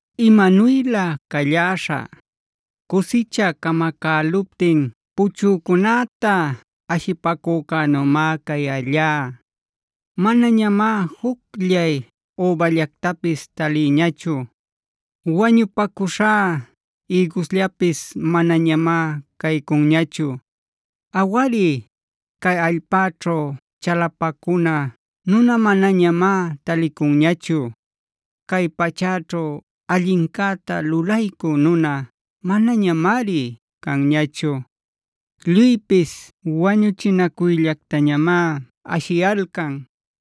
¡Imanuylä calläśhä! Cusicha camacäluptin puchücunäta ashipacücänümá cayällá. Manañamá jucllay üballactapis talïñachu; wañupacuśhá ïgusllapis manañamá caycunñachu. Awari, cay allpäćhu chalapacuna nuna manañamá talicunñachu. Cay pachäćhu allincäta lulaycü nuna manañamari canñachu. Lluypis wañuchinacuyllactañamá ashiyalcan;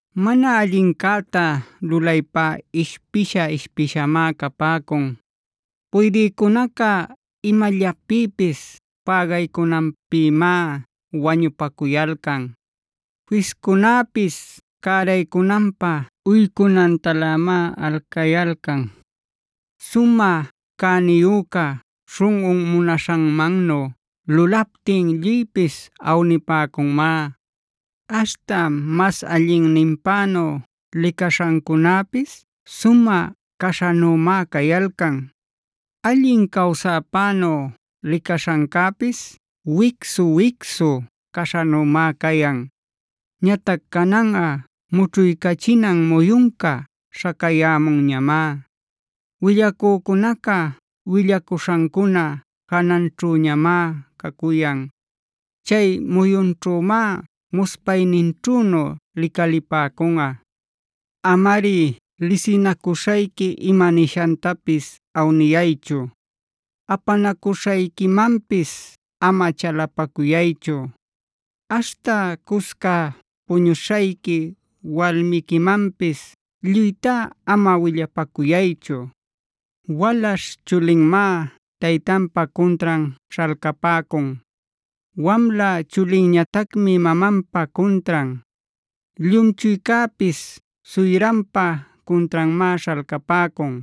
Mana allincäta lulaypá ishpisha-ishpishamá capäcun. Puydïcunaca imallapïpis pägaycunanpïmá wañupacuyalcan; fiscunäpis cäraycunanpä uycunantalämá alcayalcan. Sumä cäniyüca śhunꞌun munaśhanmannu lulaptin lluypis awnipäcunmá. Aśhta mas allinninpänu licaśhancunäpis sumä caśhanümá cayalcan. Allin cawsäpänu licaśhancäpis wicsu-wicsu caśhanümá cayan. Ñatac cananꞌa mućhuycachinan muyunca śhacayämunñamá. Willacücunaca willacuśhancuna jananćhüñamá cacuyan. Chay muyunćhümá muspayninćhünu licalipäcunꞌa. Amari lisinacuśhayqui ima nishantapis awniyaychu; apanacuśhayquimanpis ama chalapacuyaychu. Aśhta cusca puñuśhayqui walmiquimanpis lluytá ama willapacuyaychu. Walaśh chulinmá taytanpa cuntran śhalcapäcun, wamla chulinñatacmi mamanpa cuntran. Llumchuycäpis suyranpä cuntranmá śhalcapäcun.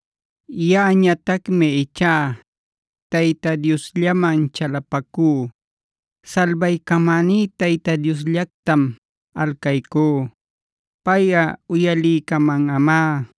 Yaꞌañatacmi ichá Tayta Diosllaman chalapacú. Salbaycamäní Tayta Diosllactam alcaycú. Payꞌa uyaliycamanꞌamá.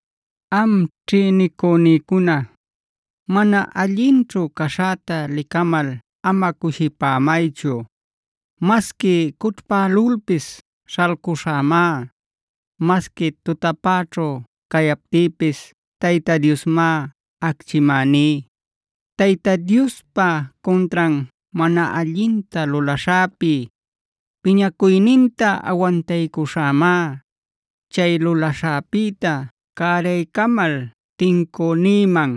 Am ćhïnicünïcuna, mana allinćhu caśhäta licamal ama cushipämaychu. Masqui cućhpälulpis śhalcuśhämá; masqui tutapäćhu cayaptïpis Tayta Diosmá acchimäní. Tayta Diospa cuntran mana allinta lulaśhäpi, piñacuyninta awantaycuśhämá. Chay lulaśhäpïta cäraycamal tincünïman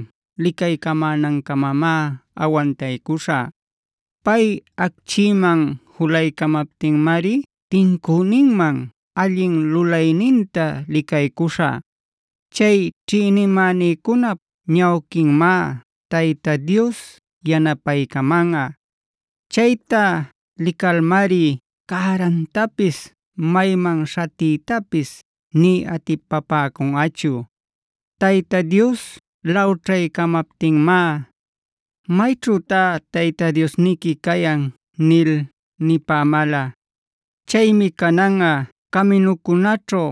licaycamänancamamá awantaycuśhä. Pay acchiman julaycamaptinmari tincüninman allin lulayninta licaycuśhä. Chay ćhïnimänïcunap ñawquinmá Tayta Dios yanapaycamanꞌa. Chayta licalmari cärantapis mayman śhatiytapis nï atipapäcunꞌachu. Tayta Dios lawćhaycamaptinmá: “¿Mayćhütá tayta diosniqui cayan?”c nil nipämäla. Chaymi cananꞌa caminucunäćhu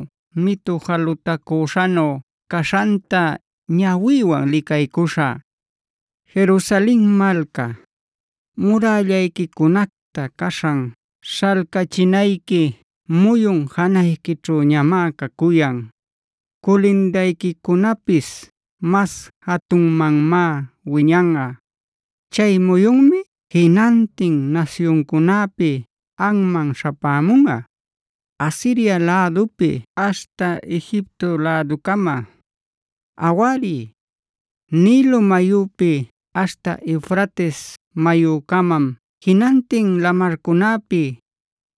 mitu jalutacüśhanu caśhanta ñawïwan licaycuśhä. Jerusalen malca, murällayquicunacta caśhan śhalcachinayqui muyun janayquićhüñamá cacuyan; culindayquicunapis mas jatunmanmá wiñanꞌa. Chay muyunmi jinantin nasyuncunapi anman śhapämunꞌa: Asiria lädupi aśhta Egipto läducama. Awari, Nilo mayupi aśhta Eufrates mayucamam jinantin lamarcunäpi,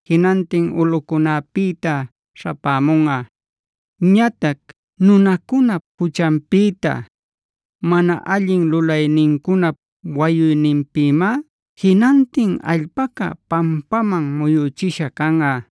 jinantin ulꞌucunäpïta śhapämunꞌa. Ñatac nunacunap juchanpïta, mana allin lulaynincunap wayuyninpïmá jinantin allpaca pampaman muyüchisha canꞌa.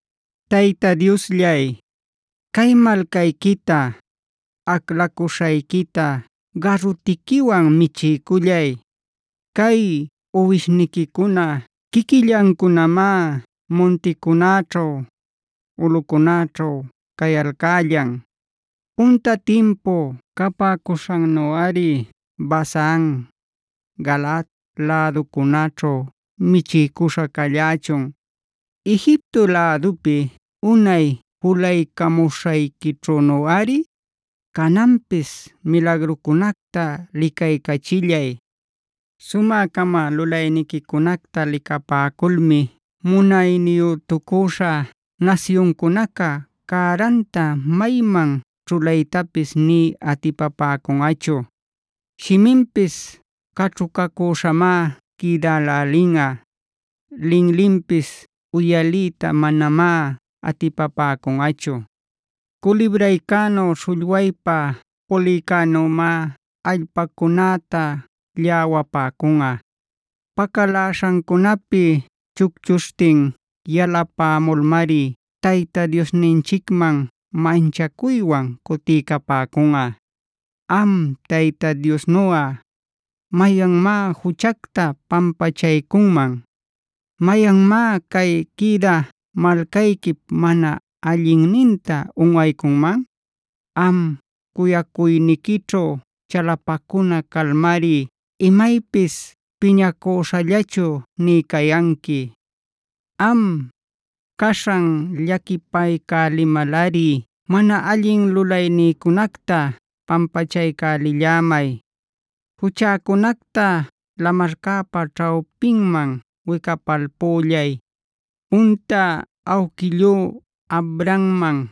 Tayta Diosllay, cay malcayquita, aclacuśhayquita garutiquiwan michiycullay. Cay uwishniquicuna quiquillancunamá munticunäćhu, ulꞌucunäćhu cayalcällan. Punta timpu capäcuśhannuꞌari Basan, Galaad läducunaćhu michiycuśha callächun. Egipto lädupi unay julaycamuśhayquićhünuꞌari, cananpis milagrucunacta licaycälichillay. Sumä-cama lulayniquicunacta licapäculmi munayniyütucüśha nasyuncunaca cäranta mayman ćhulaytapis nï atipapäcunꞌachu; shiminpis caćhucacüśhamá quïdälälinꞌa; linlinpis uyaliyta manamá atipapäcunꞌachu. Culibraycänu, śhullwaypa pulïcänümá allpacunäta lläwapäcunꞌa. Pacaläśhancunapi chucchuśhtin yalapämulmari tayta diosninchicman manchacuywan cutiycapäcunꞌa. ¿Am Tayta Diosnuꞌa, mayanmá juchacta pampachaycunman? ¿Mayanmá cay quïdä malcayquip mana allinninta unꞌaycunman? Am, cuyacuyniquićhu chalapacuna calmari imaypis piñacüśhallachu nï cayanqui. Am, caśhan llaquipaycälimalꞌari mana allin lulaynïcunacta pampachaycälillämay. Juchäcunacta lamarcäpa ćhawpinman wicapalpüllay. Punta awquillú Abrahamman,